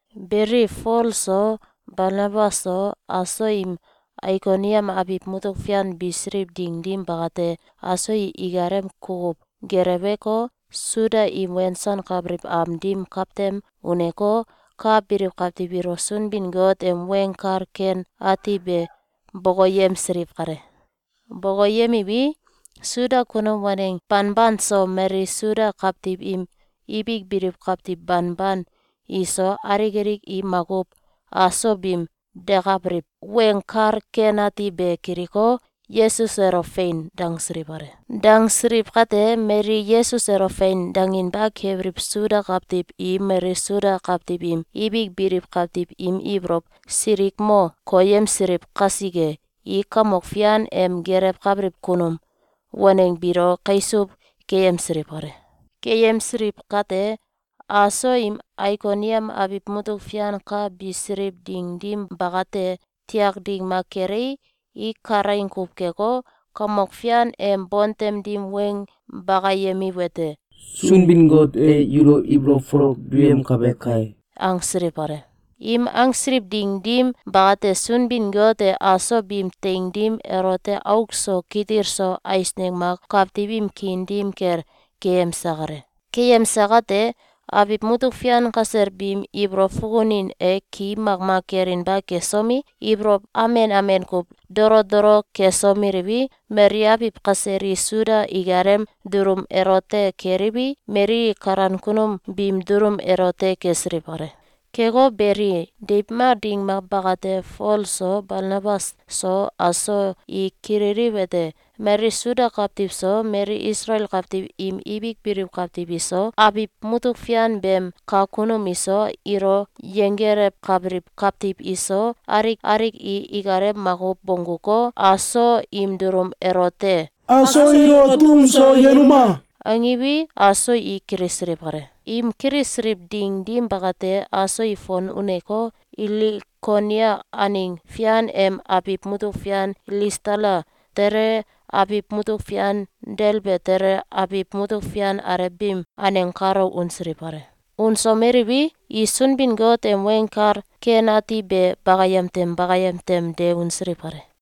Beli, Fol so, Balnabas so, aso im Aikoniam abiw mutuk fian bisiliw ding dim bakate, aso i ikalem kukuw geleweko, Suda im wensankabiliw am dim kawtem uneko, ka biliw kawtiw ilo Sunbin-Got em Weng Kal Ken Ati be bokoyemsiliw kale. Bokoyemiwi, Suda kunum waneng banban so, mali Suda kawtiw im ibik biliw kawtiw banban iso, alik alik i makuw aso biim dekabiliw Weng Kal Ken Ati be kiliko, Yesus elo “Fein!”, dangsiliw kale. Dangsiliw kate, mali Yesus elo “Fein!”, danginba kebiliw Suda kawtiw i mali Suda kawtiw im ibik biliw kawtiw im ibolow silikmo koyemsiliw kasike, i Kamok Fian em gelewkabiliw kunum waneng biilo kaisuw keyemsiliw kale. Keyemsiliw kate, aso im Aikoniam abiw mutuk fian ka bisiliw ding dim bakate, tiak ding mak kelei, i kalaing kuw keko, Kamok Fian em bontem dim weng bakayemiwete: “Sunbin-Got e yulo ibolow folok duyemkabe kai!”, angsiliw kale. Im angsiliw ding dim bakate, Sunbin-Got e aso biim teing dim elote auk so kitil so eisneng mak kawtiw im kiin dim kel keyemse kale. Keyemse kate, abiw mutuk fian kasel biim ibolow fukunin e ki makmak kelinba kesomi, ibolow amen amen kuw dolo dolo kesomeliwi, mali abiw kasel i Suda ikalem dulum elote keliwi, mali i kalan kunum biim dulum elote kesiliw kale. Keko beli, deiw mak ding mak bakate, Fol so, Balnabas so, aso i kililiwete: Mali Suda kawtiw so, mali Isalael kawtiw im ibik biliw kawtiw iso, abiw mutuk fian beem kak kunum iso, ilo yenggelewkabiliw kawtiw iso, alik alik i ikalem makuw bongguko, aso im dulum elote “Aso ilo tum so yenuma!”, angiwi, aso i kilisiliw kale. Im kilisiliw ding dim bakate, aso i fon uneko, Ilikonia aneng fian em abiw mutuk fian Ilistala tele, abiw mutuk fian Delbe tele, abiw mutuk fian alew biim aneng kalo unsiliw kale. Unsomeliwi, i Sunbin-Got em Weng Kal Ken Ati be bakayem tem bakayem tem de unsiliw kale.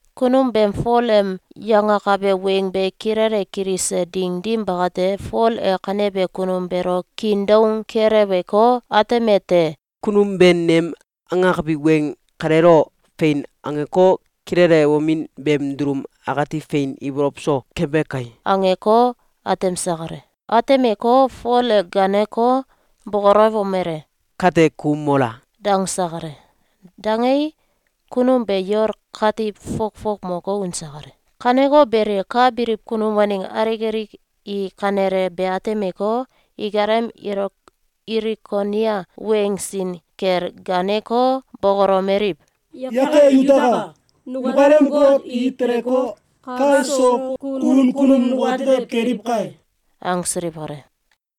Kunum beem Fol em yangakabe weng be kilele kilise ding dim bakate, Fol e kanebe kunum beelo kiin doung keleweko, atemete: “Kunum be nem angakabi weng kaleelo ‘Fein!’, angeko, kilelewomin beem dulum akati fein ibolow so kebe kai!”, angeko, atemse kale. Atemeko, Fol e gaaneko, bokolewomele: “Kate ku mola!”, dangse kale. Dangei, kunum be yol katiw fokfok moko, unse kale. Kaneko beli, ka biliw kunum waneng alik alik i kanele be atemeko, ikalem Ilikonia weng sin kel gaaneko, bokolomeliw: “Yakai yutaka! Nukalem got i teleko, kal so kun kunum nukatetew keliw kai!”, angsiliw kale.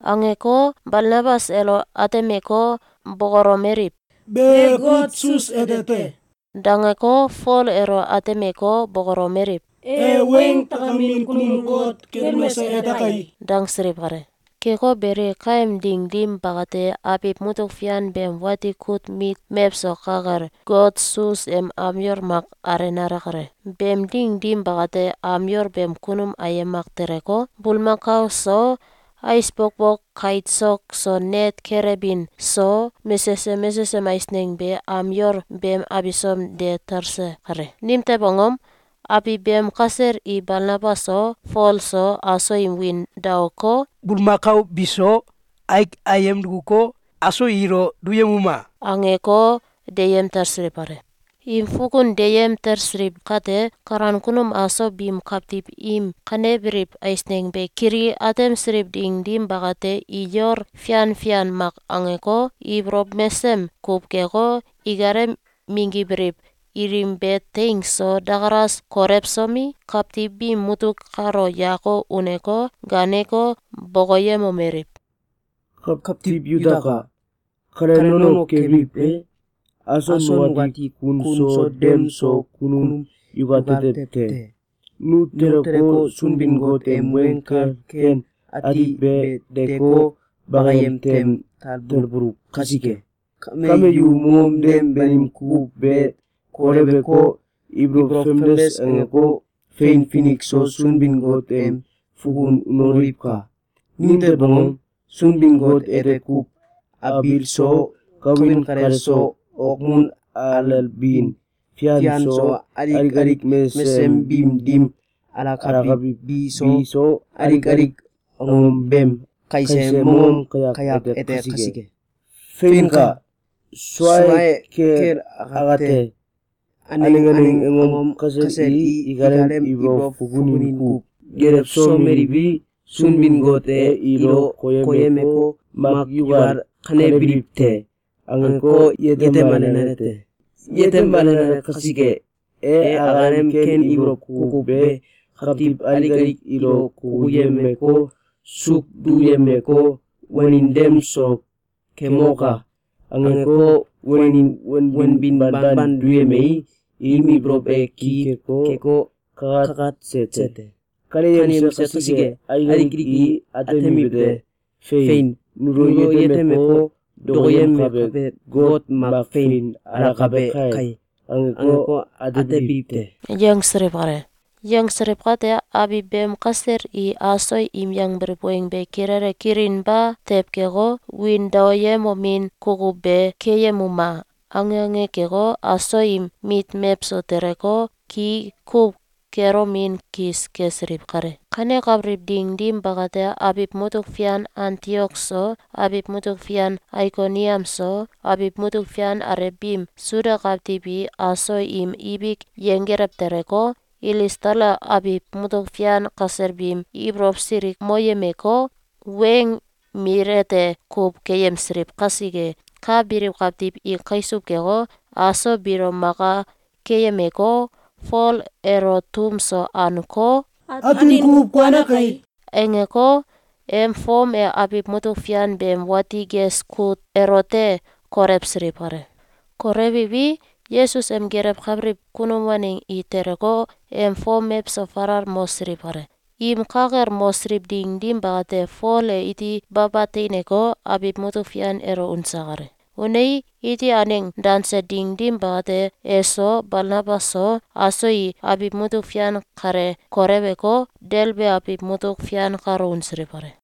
Angeko, Balnabas elo atemeko, bokolomeliw: “Be Got Sus ete te!”, dangeko, Fol elo atemeko, bokolomeliw: “E weng takamin kunum got Kelmes ete kai!”, dangsiliw kale. Keko beli, kaem ding dim bakate, abiw mutuk fian beem wati kut mit mewso ka kel, got Sus em am yol mak alenale kale. Beem ding dim bakate, am yol beem kunum ayem mak teleko, bulmakao so, ais bokbok kait sok so net kelebin so, mesesem mesesem eisneng be am yol beem abisom de talse kale. Nimtew angom? Abiw beem kasel i Balnabas so, Fol so, aso im wiin daoko, “Bulmakao biso aik ayem dukuko, aso ilo duyemuma!”, angeko, deyem talsiliw kale. Im fukun deyem talsiliw kate, kalan kunum aso biim kawtiw im kanebiliw eisneng be kili atemsiliw ding dim bakate, i yol fian fian mak angeko, ibolow mesem kuw keko, ikalem minggibiliw ilim be teing so dakalas kolewsomi, kawtiw biim mutuk kalo yako uneko, gaaneko, bokoyemomeliw: “Kawtiw yutaka! Kale nono kebiliw e? Aso nukati kun so dem so kunum yukatetew te! Nu teleko, Sunbin-Got em Weng Kal Ken Ati be deeko, bakayem tem talbuluw kasike. Kame yu mongom dem banim kukuw be koleweko, ibolow famdes angeko, fein finik so Sunbin-Got em fukun unoliwka! Nimtew angom? Sunbin-Got ete kuw abiil so, kawin kale so, okmun alelbin fian so, alik alik mesesem biim dim alakabiliw bi so, alik alik angom beem kaise mongom kayak ete kasike. Feinka! Suae kel akate, aneng aneng angom kasel i ikalem ibolow fukunin kuw gelewsomeliwi, Sunbin-Got e ilo koyemeko, ‘Mak yukal kanebiliw te!’, angeko, yetemalenale te. Yetemalenale kasike, e akalem ken ibolow kukuw be kawtiw alik alik ilo kukuyemeko, suuk duyemeko, ‘Wanin dem so kemoka!’, angeko, wanin wanbin banban duyemei, im ibolow e ki keko, kakatse te. Kaneyemse kasike, alik alik i atemiwete: ‘Fein! Nulo yetemeko, dokoyemkabe got mak fein alakabe kai!’, angeko, atebiliw te.”, yangsiliw kale. Yangsiliw kate, abiw beem kasel i aso im yangbiliw weng be kilele kilinba tew keko, “Wiin daoyemomin kukuw be keyemuma!”, ange ange keko, aso im mit mewso teleko, ki kuw kelomin kis kesiliw kale. Kanekabiliw ding dim bakate, abiw mutuk fian Antiok so, abiw mutuk fian Aikoniam so, abiw mutuk fian alew biim Suda kawtiw i aso im ibik yenggelew teleko, Ilistala abiw mutuk fian kasel biim ibolow silikmoyemeko, weng mil ete kuw keyemsiliw kasike, ka biliw kawtiw i kaisuw keko, aso biilo maka keyemeko, Fol elo tum so anko, “Atin kuw kuane kai!”, angeko, em fom e abiw mutuk fian beem wati ges kut elote kolewsiliw kale. Kolewiwi, Yesus em gelewkabiliw kunum waneng i teleko, em fom mewso falal mosiliw kale. Im ka kel mosiliw ding dim bakate, Fol e iti baba teineko, abiw mutuk fian elo unse kale. Unei, iti aneng danse ding dim bakate, eso, Balnabas so, aso i abiw mutuk fian kale koleweko, Delbe abiw mutuk fian kalo unsiliw kale.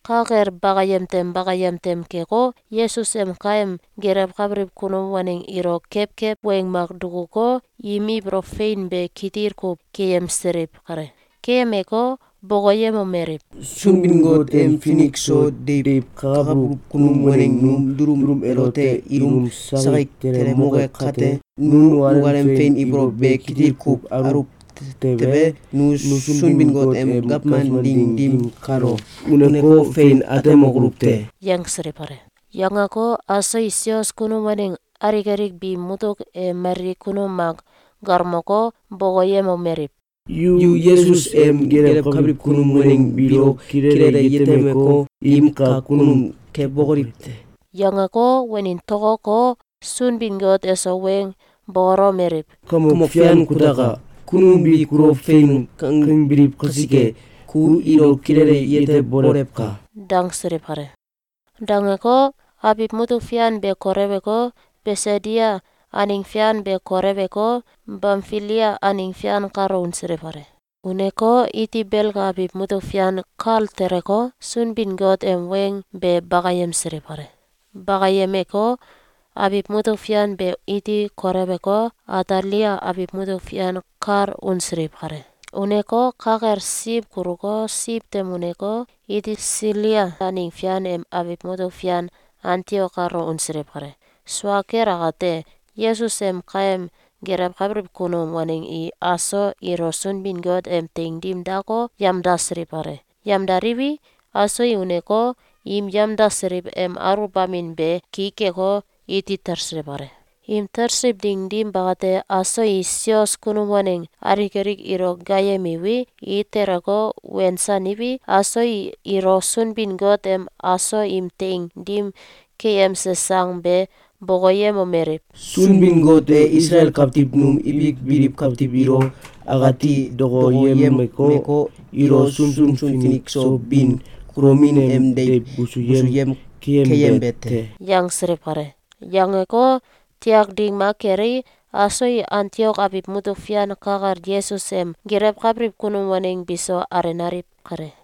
ka kel bakayem tem bakayem tem keko, Yesus em kaem gelewkabiliw kunum waneng ilo kewkew weng mak dukuko, im ibolow fein be kitil kuw keyemsiliw kale. Keyemeko, bokoyemomeliw: “Sunbin-Got em finik so deiw kakabuluw kunum waneng num dulum elote ilum sakik telemoke kate, nu nukalem fein ibolow be kitil kuw aluw tewe, nu Sunbin-Got em gawman ding dim kalo uneko, fein atemokoluw te.”, yangsiliw kale. Yangeko, aso i sios kunum waneng alik alik biim mutuk e mali kunum mak galmoko, bokoyemomeliw: “Yu Yesus em gelewkabiliw kunum waneng biilo kilele yetemeko, im kak kunum kebokoliw te!”, yangeko, wanin tokoko, Sunbin-Got eso weng bokolomeliw: “Kamok Fian kutaka! Kunum bi kulo ‘Fein!’, kangbiliw kasike, ku ilo kilele yetebolewka!”, dangsiliw kale. Dangeko, abiw mutuk fian be koleweko, Bisidia aneng fian be koleweko, Bamfilia aneng fian kalo unsiliw kale. Uneko, iti Belga abiw mutuk fian kal teleko, Sunbin-Got em weng be bakayemsiliw kale. Bakayemeko, abiw mutuk fian be iti koleweko, Atalia abiw mutuk fian kal unsiliw kale. Uneko, ka kel siw kuluko, siw tem uneko, iti Silia aneng fian em abiw mutuk fian Antiok kalo unsiliw kale. Sua kel akate, Yesus em kaem gelewkabiliw kunum waneng i aso ilo Sunbin-Got em teing dim dako, yamdasiliw kale. Yamdaliwi, aso i uneko, im yemdasiliw em aluwbamin be ki keko, iti talsiliw kale. Im talsiliw ding dim bakate, aso i sios kunum waneng alik alik ilo gaayemiwi, i teleko, wensaniwi, aso i ilo Sunbin-Got em aso im teing dim keyemse sang be bokoyemomeliw: “Sunbin-Got e Isalael kawtiw num ibik biliw kawtiw ilo akati dokoyemeko, ilo sunsun finik so bin kulomin em deiw busuyem keyembe te!”, yangsiliw kale. Yangeko, tiak ding mak kelei, aso i Antiok abiw mutuk fian ka kel Yesus em gelewkabiliw kunum waneng biso alenaliw kale.